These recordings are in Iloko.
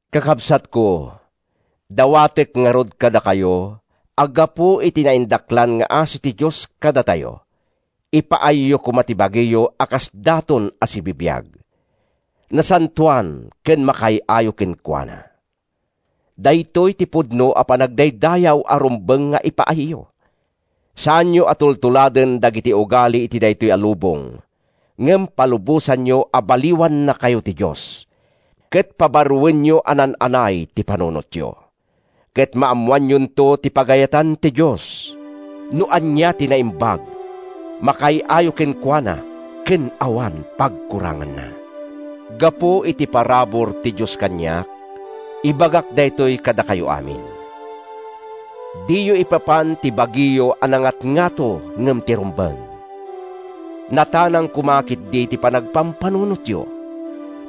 Kakabsatko, dawatek ngarud kadakayo, a gapu iti naindaklan nga asi ti Dios kadatayo, ipaayyo koma ti bagiyo a kas daton a sibibiag, nasantoan ken makaay-ayo kenkuana. Daytoy ti pudno a panagdaydayaw a rumbeng nga ipaayyo. Saanyo a tultuladen dagiti ugali iti daytoy a lubong ngem palubosanyo a baliwannakayo ti Dios ket pabaroenyo a naan-anay ti panunotyo. Ket maammoanyonto ti pagayatan ti Dios—no ania ti naimbag, makaay-ayo kenkuana ken awan pagkuranganna. Gapu iti parabur ti Dios kaniak, ibagak daytoy kadakayo amin: Diyo ipapan ti bagiyo a nangatngato ngem ti rumbeng. Natanang koma ketdi ti panagpampanunotyo,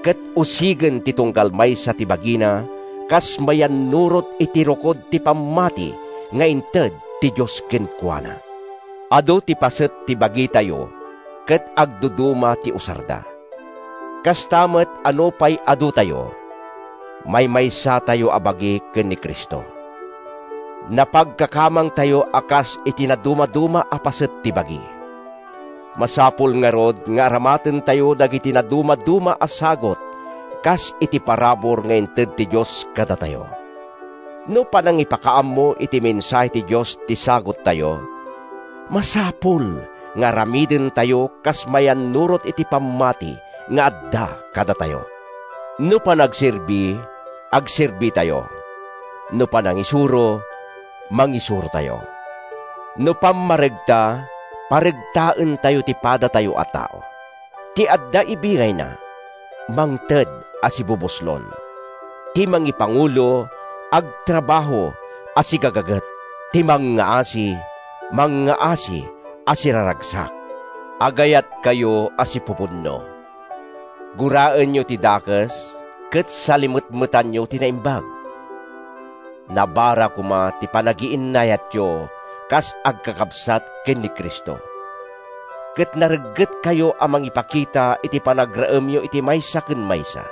ket usigen ti tunggal maysa ti bagina kas mayannurot iti rukod ti pammati nga inted ti Dios kenkuana. Adu ti paset ti bagitayo ket agduduma ti usarda. Kasta met a nupay adutayo, maymaysatayo a bagi ken ni Cristo. Napagkakamangtayo a kas iti nadumaduma a paset ti bagi. Masapul ngarud nga aramatentayo dagiti nadumaduma a sagut kas iti parabur nga inted ti Dios kadatayo. No panangipakaammo iti mensahe ti Dios ti saguttayo, masapul nga aramidentayo kas mayannurot iti pammati nga adda kadatayo. No panagserbi, agserbitayo. No panangisuro, mangisurotayo. No pammaregta, paregtaentayo ti padatayo a tao. Ti adda ibingayna, mangted a sibubuslon. Ti mangipangulo, agtrabaho a sigagaget. Ti mangngaasi, mangngaasi a siraragsak. Agayatkayo a sipupudno. Guraenyo ti dakes ket salimetmetanyo ti naimbag. Nabara koma ti panagiinnayatyo kas agkakabsat ken ni Cristo, ket nareggetkayo a mangipakita iti panagraemyo iti maysa ken maysa.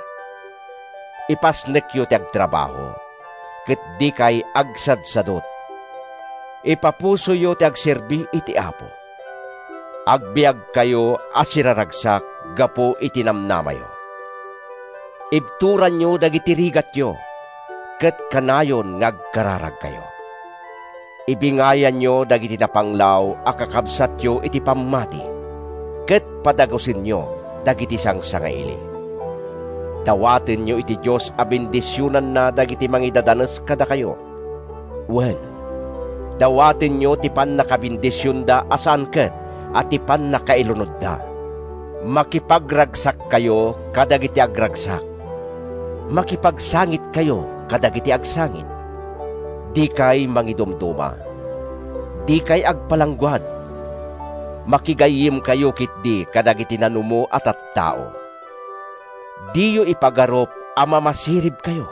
Ipasnekyo ti agtrabaho, ket dikay agsadsadut. Ipapusoyo ti agserbi iti Apo. Agbiagkayo a siraragsak gapu iti namnamayo. Ibturanyo dagiti rigatyo, ket kanayon nga agkararagkayo. Ibingayanyo dagiti napanglaw a kakabsatyo iti pammati, ket padagusenyo dagiti sangsangaili. Dawatenyo iti Dios a bendisionanna dagiti mangidadanes kadakayo. Wen, dawatenyo ti pannakabendisionda a saan ket a ti pannakailunodda. Makipagragsakkayo kadagiti agragsak. Makipagsangitkayo kadagiti agsangit. Dikay mangidumduma. Dikay agpalangguad; makigayyemkayo ketdi kadagiti nanumo a tattao. Diyo ipagarup a mamasiribkayo.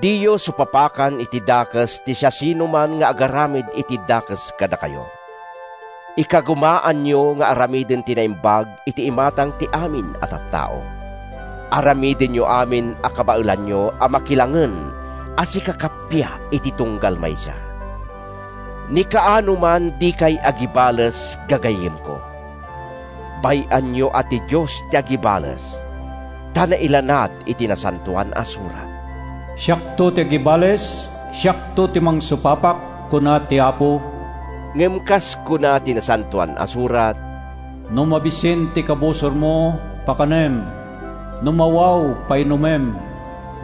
Diyo supapakan iti dakes ti siasinoman nga agaramid iti dakes kadakayo. Ikagumaanyo nga aramiden ti naimbag iti imatang ti amin a tattao. Aramidenyo amin a kabaelanyo a makilangen a sikakappia iti tunggal maysa. Ni kaanoman dikay agibales, gagayyemko. Bay-anyo a ti Dios ti agibales. Ta nailanad iti Nasantoan a Surat: “Siakto ti agibales, siakto ti mangsupapak, kuna ti Apo.” Ngem kas kuna ti Nasantoan a Surat: “No mabisin ti kabusormo, pakanem; no mawaw, painumem.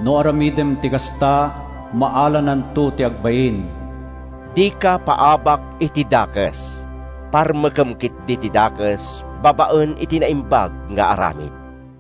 No aramidem ti kasta, maalananto ti agbain.” Dika paabak iti dakes. Parmekem ketdi ti dakes babaen iti naimbag nga aramid.